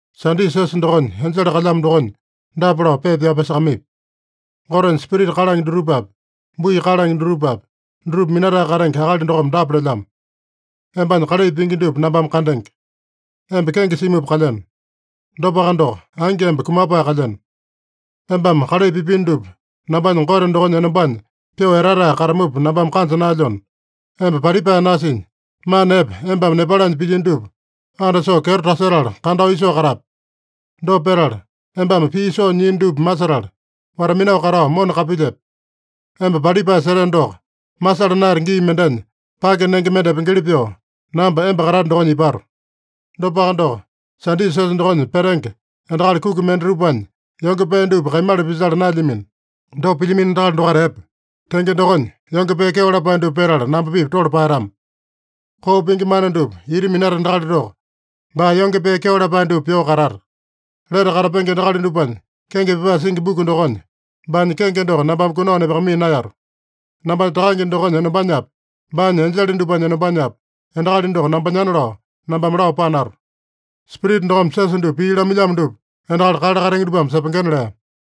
“Sadisa siosa dokonya enjele kalyamo dokonya dapa lao pepa pyao pyasakamaipi: ‘Gotenya spirita kalange dutupapi, bui kalange dutupapi, dutupa minatae katenge akali dokome dapa lelyamo: Embanya kalai pingi dupa nambame kandenge. Emba kenge simupa kalyeno. Dopaka doko, angi emba kumapae kalyeno. Embame kalai pipino dupa nambanya Gote dokonya enombanya pyoo etatae katamupa nambame kanja naelyona, emba palipae nasinya, mana epe embame nepalanya pilyino dupa andasoo kyeto tasetala kandao isoo katape. Dopa petala, embame pii soo nyiino dupa masetala, wata-minao katao mona kapilyepe. Emba palipae seteno doko, masala naeyate gii mendenya pake nenge mende epengeli pyoo, namba emba katate dokonya ipato. Dopaka doko, Sadisa siosa dokonya petenge endakali kuki mendatupanya yonge pee dupa kaimala pisala naelyamino. Dopa pilyamino endakali dokaita epe. Tenge dokonya, yonge pee kyeo lapae dupa petala namba-pipa tole paeyatama. Koo pingi mana dupa ita minata endakali doko, baa yonge pee kyeo lapae dupa pyoo katata. Lete katapenge endakali dupanya kenge pyapae singi buku dokonya baanya kenge doko nambame kunao nepakamaiya naeyato. Nambanya Takange dokonya enombanyapi, baanya enjele dupanya enombanyapi, endakali doko nambanyana lao, nambame lao panato. Spirita dokome siosa dupa pii lamailyamo dupa endakali kale katenge dupame sepengena’” lea.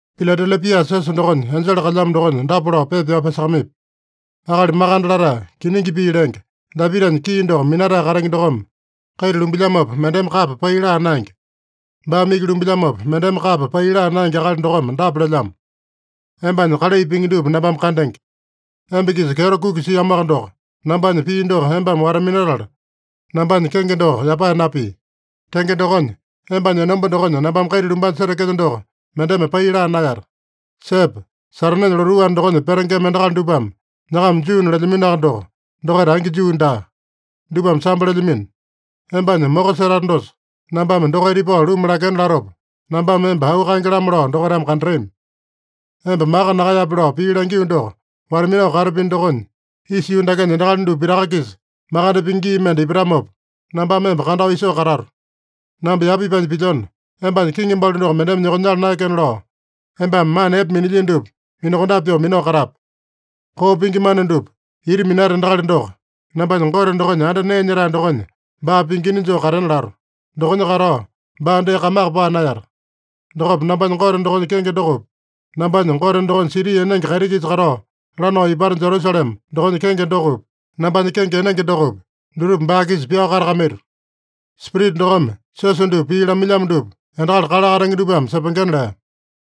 “Piladelepia siosa dokonya enjele kalyamo dokonya dapa lao pepa pyao pyasakamaipi: ‘Akali makande latae, kiningi pii lenge, Dapitanya kii doko minatae katenge dokome, kaita lumbilyamopa mendeme kapa pai laa naenge. Baame iki lumbilyamopa, mendeme kapa pai laa naenge akali dokome dapa lelyamo: Embanya kalai pingi dupa nambame kandenge. Emba-kisa kyeto kuki siamoaka doko, nambanya pii doko embame wata-minatala, nambanya kenge doko yapae napii. Tenge dokonya, embanya enomba dokonya nambame kaita lumbanya setekelyo doko mendeme pai laa naeyata. Sepe! Satanenya lotuu anda dokonya petengema endakali dupame nyakama Juuna lelyaminoaka doko, dokaita angi Juu daa. Dupame sambo lelyamino. Embanya moko setate dosa, nambame dokaita ipao luma lakena latopa, nambame emba auu kaenge-lamo lao dokaitame kandatami. Emba maka nakaeyape lao pii langio doko wata-minao katapino dokonya, isa yuu dakenya endakali dupa pitaka-kisa makande pingi gii mende ipatamopa, nambame emba kandao isoo katato. Namba yapa ipanya pilyona, embanya kiŋi balu doko mendeme nyokonyala naekena lao, embame mana epe minilyino dupa minakondape pyoo minao katape. Koo pingi mana dupa ita minata endakali doko, nambanya Gote dokonya anda nee nyetae dokonya baa pingina joo katena lato. Dokonya katao baa dee kamaka paa naeyata. Dokopa nambanya Gote dokonya kenge dokopi, nambanya Gote dokonya siti enenge kaiti-kisa katao lanao ipata Jerusalema dokonya kenge dokopi, nambanya kenge enenge dokopi, dutupa baa-kisa pyao katakamaito. Spirita dokome siosa dupa pii lamailyamo dupa endakali kale katenge dupame sepengena’” lea.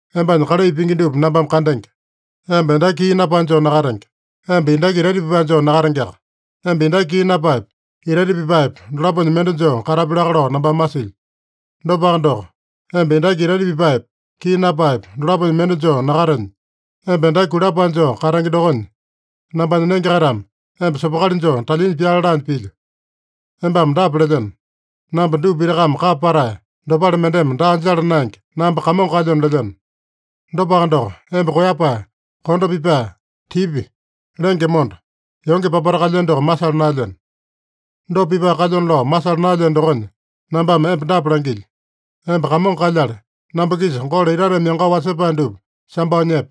Embanya kalai pingi dupa nambame kandenge. Emba endaki kii napae joo nakatenge. Emba endaki itaita pipae joo nakatengeaka. Emba endaki kii napaepa, itaita pipaepa, dolaponya mende joo katapi laka lao nambame masilyo. Dopaka doko, emba endaki itaita pipaepa, kii napaepa, dolaponya mende joo nakatenya, emba endaki kulapae joo katenge dokonya, nambanya nenge-kaitame emba sopokali joo talyinya pyale laanya pilyo. Embame dapa lelyeno: “Namba dupa pitakame kapa patae, dopale mendeme daa jala naenge, namba kamongo kalyona” lelyeno. Dopaka doko, emba koeyapae, kondo pipae, tipya, lenge monda, yonge papata kalyeno doko masala naelyeno. Dopa pipae kalyona lao masala naelyeno dokonya, nambame emba dapa langilyo: Emba kamongo kalyale, namba-kisa golo itateme yangao wasepae dupa sambao nyepe.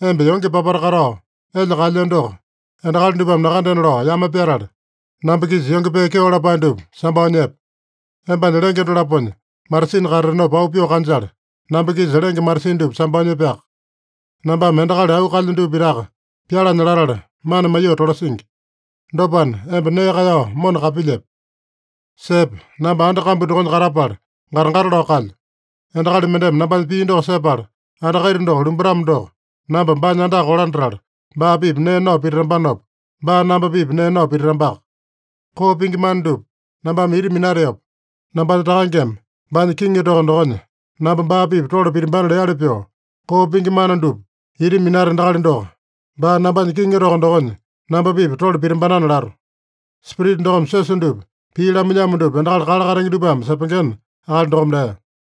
Emba yonge papata katao elya kaelyeno doko endakali dupame nakandena lao yame pyatale, namba-kisa yonge pee kyeo lapae dupa sambao nyepe. Embanya lenge dolaponya matasini katatenopa auu pyoo kanjale, namba-kisa lenge matasini dupa sambao nyepeaka. Nambame endakali auu kaelyo dupa pitaka pyalanya latala mana maiyoo tolasingi. Dopana, emba nee kaeyao mona kapilyepe. Sepe! Namba anda kambu dokonya katapala gata-gata lao kalyo. Endakali mendeme nambanya pii doko sepala anda kaita doko lumbatamo doko, namba baanya andaka kolandatala, baa-pipa nee nao pititambanopa, baa namba-pipa nee nao pititambaka. Koo pingi mana dupa nambame ita minateopa, nambanya Takangeme baanya kiŋi toko dokonya namba baa-pipa tole pitimbanana leali pyoo, koo pingi mana dupa ita minata endakali doko, baa nambanya kiŋi toko dokonya namba-pipa tole pitimbanana lato. Spirita dokome siosa dupa pii lamailyamo dupa endakali kale katenge dupame sepengena,’” akali dokome lea.